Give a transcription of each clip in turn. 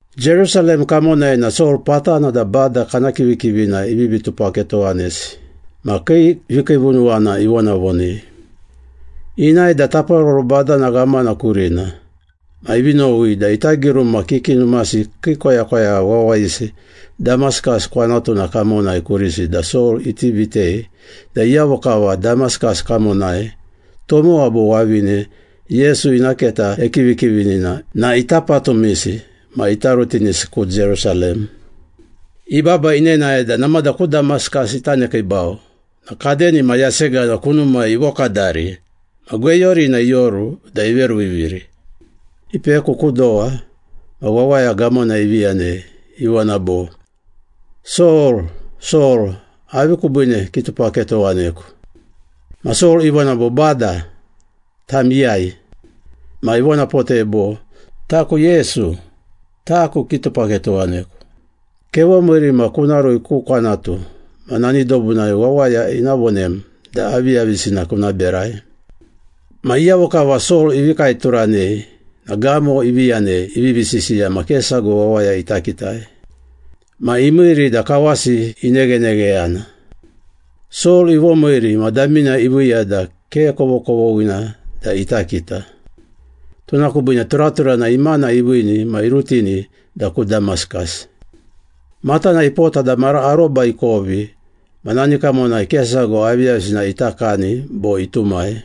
Jerusalem kamonai na Sol patana da Bada kana kivikivina ivivi tupaketowanesi ma kii vikiivunuwana ivonavonei. Inae da taparoro badana ghamana kurina, ma ivi nowi da ita giruma kiki numasi kii koyakoyagha wawayisi Damaskas kwanatuna kamonai kurisi da Sol iti vitei da iyavo kava Damaskas kamonai, tomowa bo wavine Yesu ina keta ekivikivini na ita patumisi ma ita rutinisi ku Jerusalem. Ibaba inenae da namada ku Damaskas ita nekiibau na kadenima yasegana kunumai ivokadari ma gweyurina ioru da iveruviviri. Ipeku ku dowa ma wawaya gamona ivi yanei, ivona bo, “Sol, Sol, avi kubiine kitupaketowaneku?” Ma Sol ivona bo, “Bada, tam iyai?” Ma ivonapotei bo, “Taku Yesu. Taku kitupaketowaneku. Kevomiiri ma kuna rui ku kwanatu ma nani dobunai wawaya ina vonem da aviyavisina kuna berai.” Ma iyavo kava Sol ivi kaeturanei na gamo ivi yanei ivivi sisiya ma ke sago wawaya ita kitai. Ma imiiri da kawasi ineghenegheyana. Sol ivomiiri ma damina iviiya da ke kovokovoghina da ita kita. Tuna kubiine turaturana imana iviini ma irutini da ku Damaskas. Matana ipota da mara aroba ikovi ma nani kamonai ke sago aviyavisina ita kani bo itumai.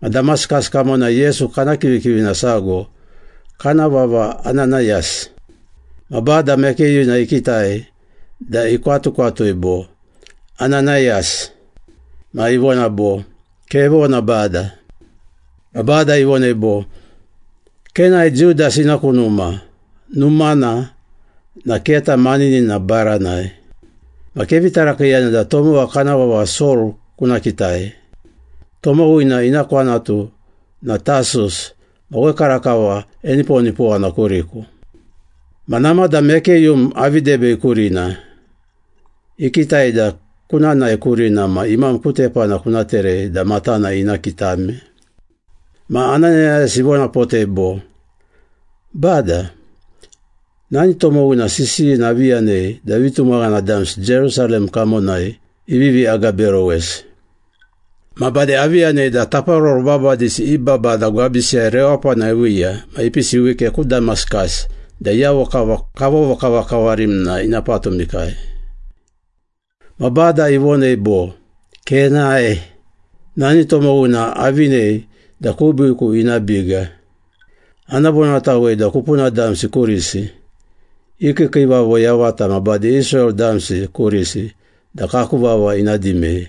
Ma Damaskas kamonai Yesu kana kivikivina sago kana vava Ananayas. Ma Bada mekeyuna ikitai da ikwatukwatui bo, “Ananayas!” Ma ivona bo, “Kevona, Bada.” Ma Bada ivonei bo, “Kenae Judas ina ku numa, numana na Keta Maninina baranai. Ma kevi tarakiiyana da tomowa kana vava Sol kuna kitai. Tomowina ina kwanatu na Tasus ma wekarakava eniponipowana kuriku. Ma namada mekeyum avi debei kurina, ikitai da kuna nae kurina ma imam ku tepana kuna terei da matana ina kitame.” Ma Ananayas ivonapotei bo, “Bada, nani tomowina sisiyina avi yanei da vitumaghana damsi Jerusalem kamonai ivivi agaberowesi. Ma bade avi yanei da taparoro babadisi i babada gwabisiyai rewapana iviiya ma ipisi wike ku Damaskas da iyavo kava kavovokavakavarim na ina patumikai.” Ma Bada ivonei bo, “Kenae! Nani tomowina avinei da kubiiku ina biga. Ana vonatawei da kupuna damsi kurisi, i kiikiivavo yavata ma bade Israel damsi kurisi da kaku vava ina dimei.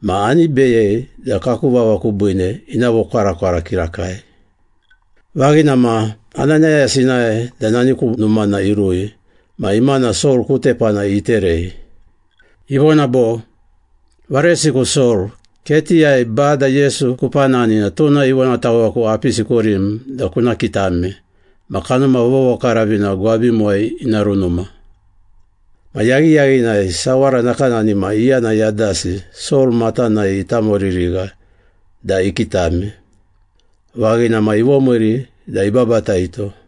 Ma ani beyei da kaku vava kubiine ina vokwarakwara kirakai.” Vaghina ma, Ananayas inae da nani ku numana irui ma imana Sol ku tepana iterei. Ivona bo, “Varesiku Sol, ketiyai Bada Yesu kupanani na tuna ivonataweku apisi kurim da kuna kitame ma Kanuma Vovokaravina gwabimuwai ina runuma.” Ma yaghiyaghinai sawara nakanani ma iyana yadasi Sol matanai itamoririgha da ikitame. Vaghina ma ivomiiri da ibabataito.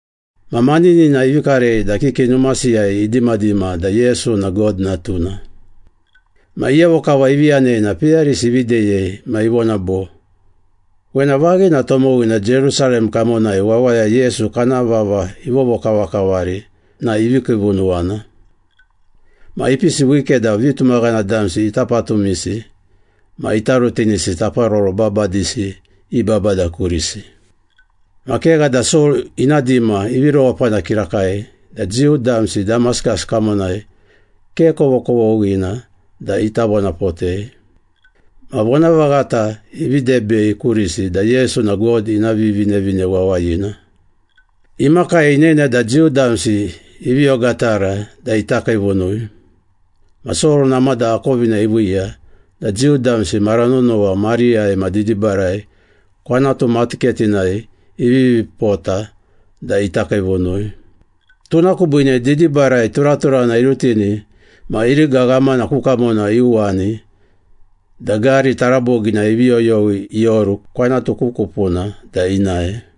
Ma maninina ivi karei da kiki numasiyai idimadima da Yesu na God Natuna. Ma iyavo kava ivi yanei na peyarisi ivi deyei ma ivona bo, “Wena vaghina tomowina Jerusalem kamonai wawaya Yesu kana vava ivovokavakavari na ivi kiivunuwana. Ma ipisi wike da vitumaghana damsi ita patumisi ma ita rutinisi taparoro babadisi i babada kurisi.” Ma kegha da Sol ina dima ivi rewapana kirakai da Jiu damsi Damaskas kamonai ke kovokovoghina da ita vonapotei. Ma vonavaghata ivi debei kurisi da Yesu na God ina Vivinevine Wawayina. Imakai inene da Jiu damsi ivi ogatara da ita kiivunui, ma Sol namada akovina iviiya da Jiu damsi mara nonowa mariyai ma didibarai kwanatu matuketinai ivivi pota da ita kiivunui. Tuna kubiine didibarai turaturana irutini ma iriga ghamana ku kamona iuwani da gari taraboginai ivi yoyowi ioru kwanatu ku kupuna da inae.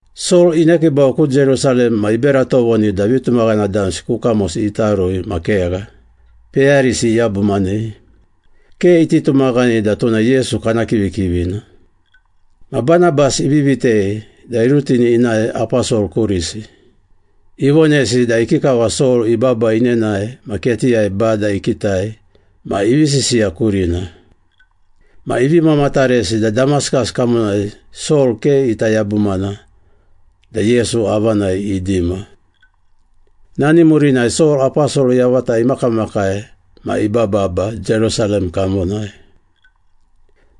Sol inekiibau ku Jerusalem ma ibera tovoni da vitumaghana damsi ku kamosi ita rui ma kegha, peyarisi iyabumanei. Ke iti tumaghanei da tuna Yesu kana kivikivina. Ma Banabas ivi vitei da irutini inae aposol kurisi. Ivonesi da ikikava Sol ibaba inenae ma ketiyai Bada ikitai ma ivi sisiya kurina. Ma ivi mamataresi da Damaskas kamonai Sol ke ita yabumana da Yesu avanai idima. Nani murinai Sol aposol yavata imakamakai ma ibababa Jerusalem kamonai.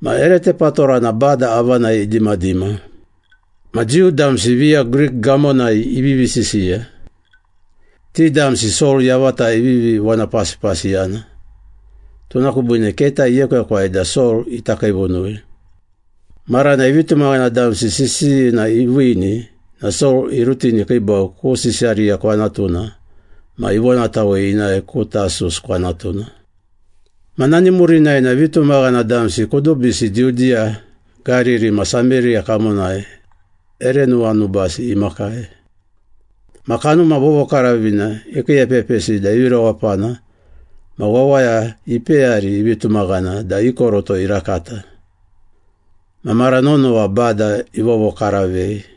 Ma ere tepatorana Bada avanai idimadima. Ma Jiu damsi viya Grik gamonai ivivi sisiya. Ti damsi Sol yavata ivivi vonapasipasiyana, tuna kubiine keta iekwekwai da Sol ita kiivunui. Maranai vitumaghana damsi sisiyina iviini na Sol irutini ikiibau ku Sisariya kwanatuna ma ivonatawei inae ku Tasus kwanatuna. Ma nani murinai na vitumaghana damsi kudubisi Judiya, Gariri ma Sameriya kamonai ere nuwanubasi imakai. Ma Kanuma Vovokaravina ikiiepepisi da ivi rewapana, ma wawaya ipeyari ivi tumaghana da i koroto irakata. Ma mara nonowa Bada ivovokaravei.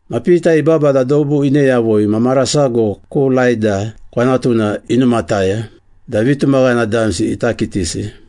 Ma Pita ibaba da dobu ine yavui ma mara sago ku Laida kwanatuna inumataya da vitumaghana damsi ita kitisi.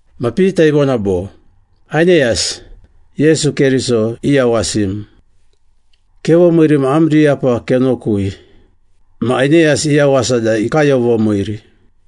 Ma Pita ivona bo, “Aineyas, Yesu Keriso iyawasim. Kevomiiri ma am riyapa kenokui.” Ma Aineyas iyawasa da ikayovomiiri.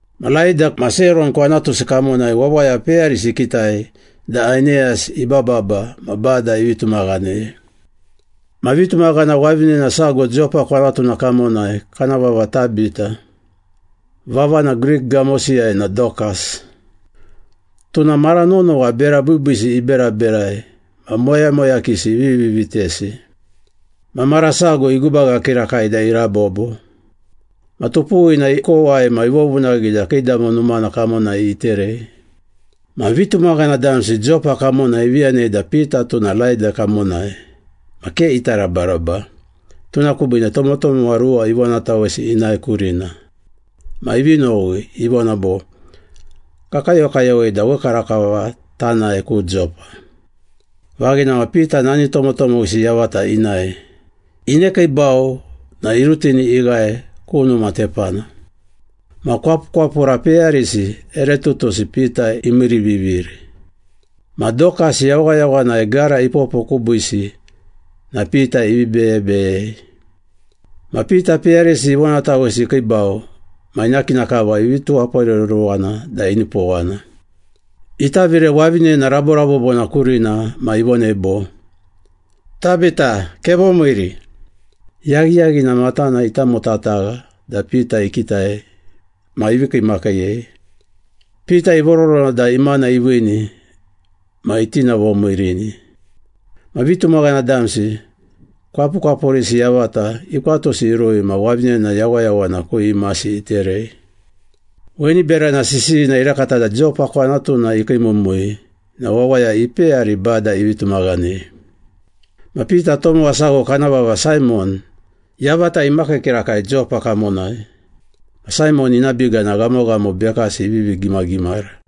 Ma Laida ma Seron kwanatusi kamonai wawaya peyarisi ikitai da Aineyas ibababa na Bada ivi tumaghanei. Ma vitumaghana wavinena sago Jopa kwanatuna kamonai kana vava Tabita (vavana Grik gamosiyai na Dokas). Tuna mara nonowa bera biibiisi iberaberai ma moyamoyakisi ivivi vitesi. Ma mara sago igubaga kirakai da irabobo. Ma tupuwina ikowai ma ivovunaghi da kiidamo numana kamonai iterei. Ma vitumaghana damsi Jopa kamonai ivi yanei da Pita tuna Laida kamonai, ma ke ita rabaraba, tuna kubiine tomotomowa ruwa ivonatawesi inae kurina. Ma ivi nowi, ivona bo, “Kakayokayowei da wekarakava tanae ku Jopa.” Vaghina ma Pita nani tomotomowisi yavata inae. Inekiibau na irutini ighae ku numa tepana. Ma kwapukwapura peyarisi ere tutusi Pita imiiriviviri. Ma Dokas yawayawanai gara ipopo kubiisi na Pita ivi beyebeyei. Ma Pita peyarisi ivonatawesi ikiibau ma ina kina kava ivi tuwaporeruruwana da inipowana. Itavire wavinena raborabobona kurina ma ivonei bo, “Tabita, kevomiiri!” Yaghiyaghina matana itamotatagha da Pita ikitai ma ivi kiimakiiyei. Pita ivororona da imana iviini ma itinavomiirini. Ma vitumaghana damsi, kwapukwapurisi yavata, ikwatusi irui ma wavinena yawayawana ku imasi iterei. Weni berana sisiyina irakata da Jopa kwanatuna ikiimumui na wawaya ipeyari Bada ivi tumaghanei. Ma Pita tomowa sago kana vava Saimon, yavata imakii kirakai Jopa kamonai. Ma Saimon ina biga na ghamoghamo bekasi ivivi gimagimara.